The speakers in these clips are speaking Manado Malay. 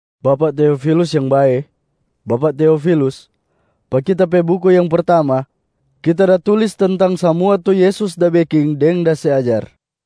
Bapak Teofilus yang bae! Bapak Teofilus, pa kita pe buku yang pertamaa, kita da tulis tentang samua tu Yesus da beking deng da se ajar,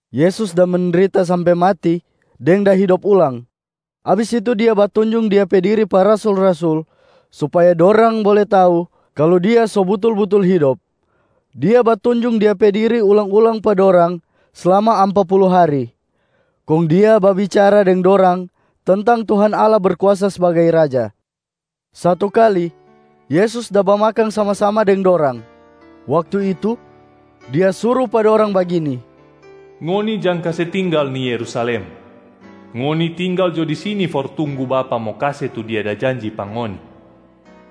Yesus da mendrita sampe mati deng da hidop ulang, abis itu Dia batunjung Dia pe Diri pa rasul-rasul supaya dorang bole tau kalu Dia so butul-butul hidop. Dia batunjung Dia pe diri ulang-ulang pa dorang slama ampa pulu hari, kong Dia babicara deng dorang tentang Tuhan Allah Berkuasa sbagai Raja. Satu kali, Yesus da bamakang sama-sama deng dorang. Waktu itu, Dia suru pa dorang bagini, “Ngoni jang kase tinggal ni Yerusalem. Ngoni tinggal jo di sini for tunggu Bapa mo kase tu Dia da janji pa ngoni,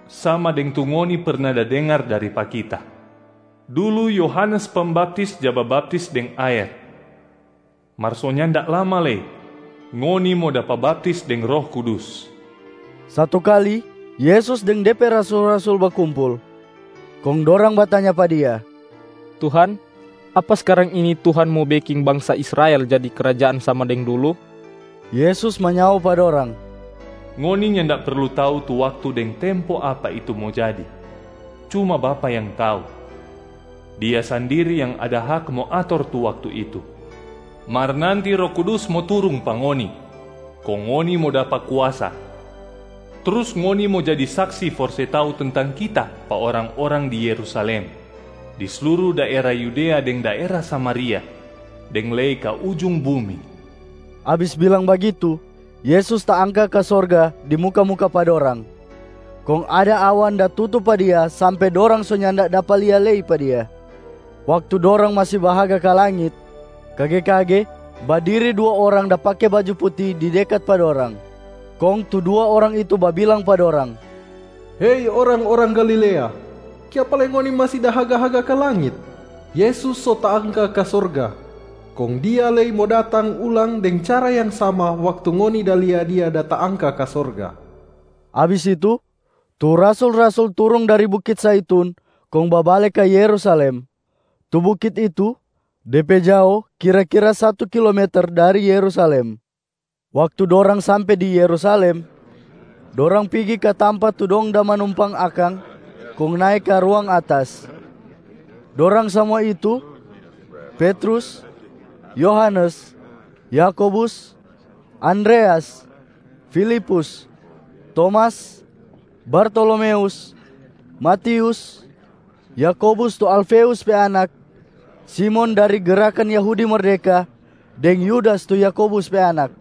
sama deng tu ngoni perna da dengar dari pa Kita. Dulu Yohanes Pembaptis ja babaptis deng aer, mar so nyanda lama lei ngoni mo dapa baptis deng Roh Kudus.” Satu kali Yesus deng De pe rasul-rasul bakumpul, kong dorang batanya pa Dia, “Tuhan, apa skarang ini Tuhan mo beking bangsa Israel jadi krajaan sama deng dulu?” Yesus manyao pa dorang, “Ngoni nyanda perlu tau tu waktu deng tempo apa itu mo jadi, cuma Bapa yang tau. Dia sandiri yang ada hak mo ator tu waktu itu. Mar nanti Roh Kudus mo turung pa ngoni kong ngoni mo dapa kuasa, trus ngoni mo jadi saksi for se tau tentang Kita pa orang-orang di Yerusalem, di sluru daera Yudea deng daera Samaria, deng lei ka ujung bumi.” Abis bilang bagitu, Yesus taangka ka sorga di muka-muka pa dorang, kong ada awan da tutu pa Dia sampe dorang so nyanda dapa lia lei pa Dia. Waktu dorang masi bahaga ka langit, kage-kage badiri dua orang da pake baju puti di dekat pa dorang. Kong tu dua orang itu babilang pa dorang, “Hei orang-orang Galilea, kiapa lei ngoni masi da haga-haga ka langit? Yesus so taangka ka sorga, kong Dia lei mo datang ulang deng cara yang sama waktu ngoni da lia Dia da taangka ka sorga.” Abis itu, tu rasul-rasul turung dari bukit Zaitun kong babale ka Yerusalem. Tu bukit itu de pe jao kira-kira satu kilometer dari Yerusalem. Waktu dorang sampe di Yerusalem, dorang pigi ka tampa tu dong da manumpang akang kong nae ka ruang atas. Dorang samua itu: Petrus, Yohanes, Yakobus, Andreas, Filipus, Tomas, Bartolomeus, Matius, Yakobus tu Alfeus pe anak, Simon dari Gerakan Yahudi Merdeka deng Yudas tu Yakobus pe anak.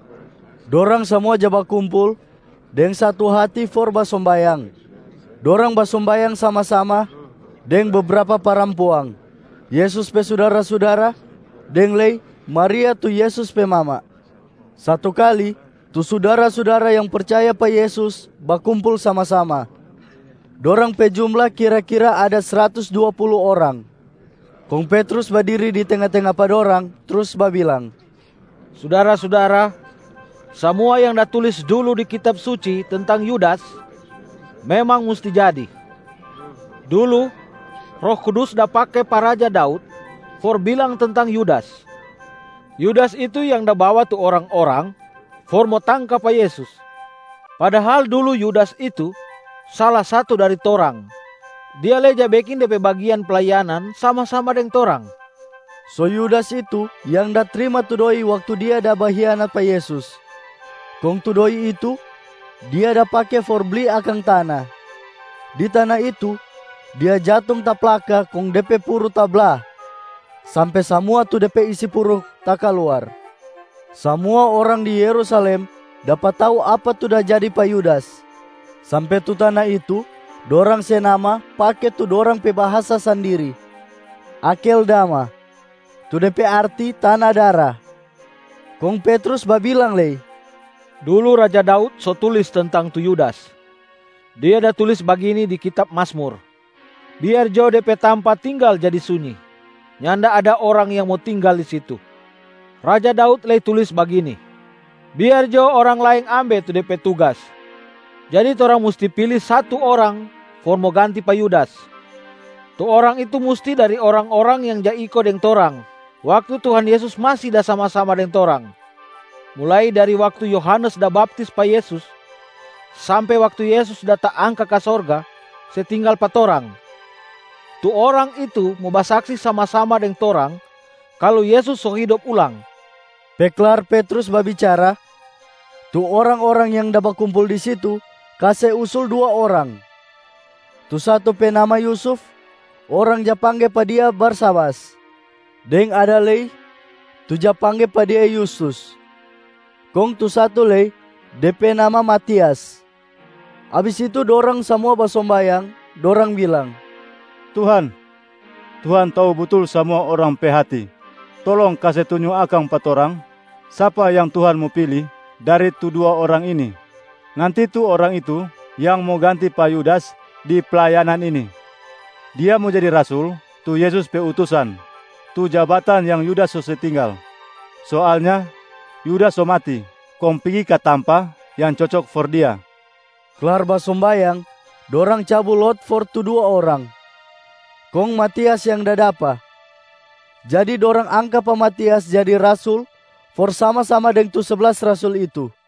Dorang samua ja bakumpul deng satu hati for basombayang. Dorang basombayang sama-sama deng bebrapa parampuang, Yesus pe sudara-sudara, deng lei Maria tu Yesus pe mama. Satu kali tu sudara-sudara yang percaya pa Yesus bakumpul sama-sama. Dorang pe jumla kira-kira ada sratus dua pulu orang. Kong Petrus badiri di tenga-tenga pa dorang trus babilang, “Sudara-sudara, samua yang da tulis dulu di Kitab Suci tentang Yudas, memang musti jadi. Dulu, Roh Kudus da pake pa raja Daud for bilang tentang Yudas. Yudas itu yang da bawa tu orang-orang for mo tangka pa Yesus. Padahal dulu Yudas itu sala satu dari torang, dia lei ja beking de pe bagian playanan sama-sama deng torang.” So Yudas itu yang da trima tu doi waktu dia da bahianat pa Yesus, kong tu doi itu dia da pake for bli akang tana. Di tana itu, dia jatung taplaka kong de pe puru tabla sampe samua tu de pe isi puru takaluar. Samua orang di Yerusalem dapa tau apa tu da jadi pa Yudas, sampe tu tana itu dorang se nama pake tu dorang pe bahasa sandiri, Akeldama, tu de pe arti Tana Dara. Kong Petrus babilang lei, “Dulu raja Daud so tulis tentang tu Yudas. Dia da tulis bagini di kitab Mazmur, ‘Biar jo de pe tampa tinggal jadi sunyi, nyanda ada orang yang mo tinggal di situ.’ Raja Daud lei tulis bagini, ‘Biar jo orang laeng ambe tu de pe tugas.’ Jadi torang musti pili satu orang for mo ganti pa Yudas. Tu orang itu musti dari orang-orang yang ja iko deng torang, waktu Tuhan Yesus masi da sama-sama deng torang, mulai dari waktu Yohanes da baptis pa Yesus sampe waktu Yesus da taangka ka sorga se tinggal pa torang. Tu orang itu mo basaksi sama-sama deng torang kalu Yesus so hidop ulang.” Pe klar Petrus babicara, tu orang-orang yang da bakumpul di situ kase usul dua orang. Tu satu pe nama Yusuf, orang ja pangge pa dia Barsabas, deng ada lei tu ja pangge pa dia Yustus. Kong tu satu lei, de pe nama Matias. Abis itu dorang samua basombayang. Dorang bilang, “Tuhan, Tuhan tau butul samua orang pe hati. Tolong kase tunjung akang pa torang sapa yang Tuhan mo pili dari tu dua orang ini. Nanti tu orang itu yang mo ganti pa Yudas di playanan ini, dia mo jadi rasul tu Yesus pe utusan, tu jabatan yang Yudas so se tinggal. Soalnya Yudas so mati kong pigi ka tampa yang cocok for dia.” Klar basombayang, dorang cabu lot for tu dua orang, kong Matias yang da dapa. Jadi dorang angka pa Matias jadi rasul for sama-sama deng tu seblas rasul itu.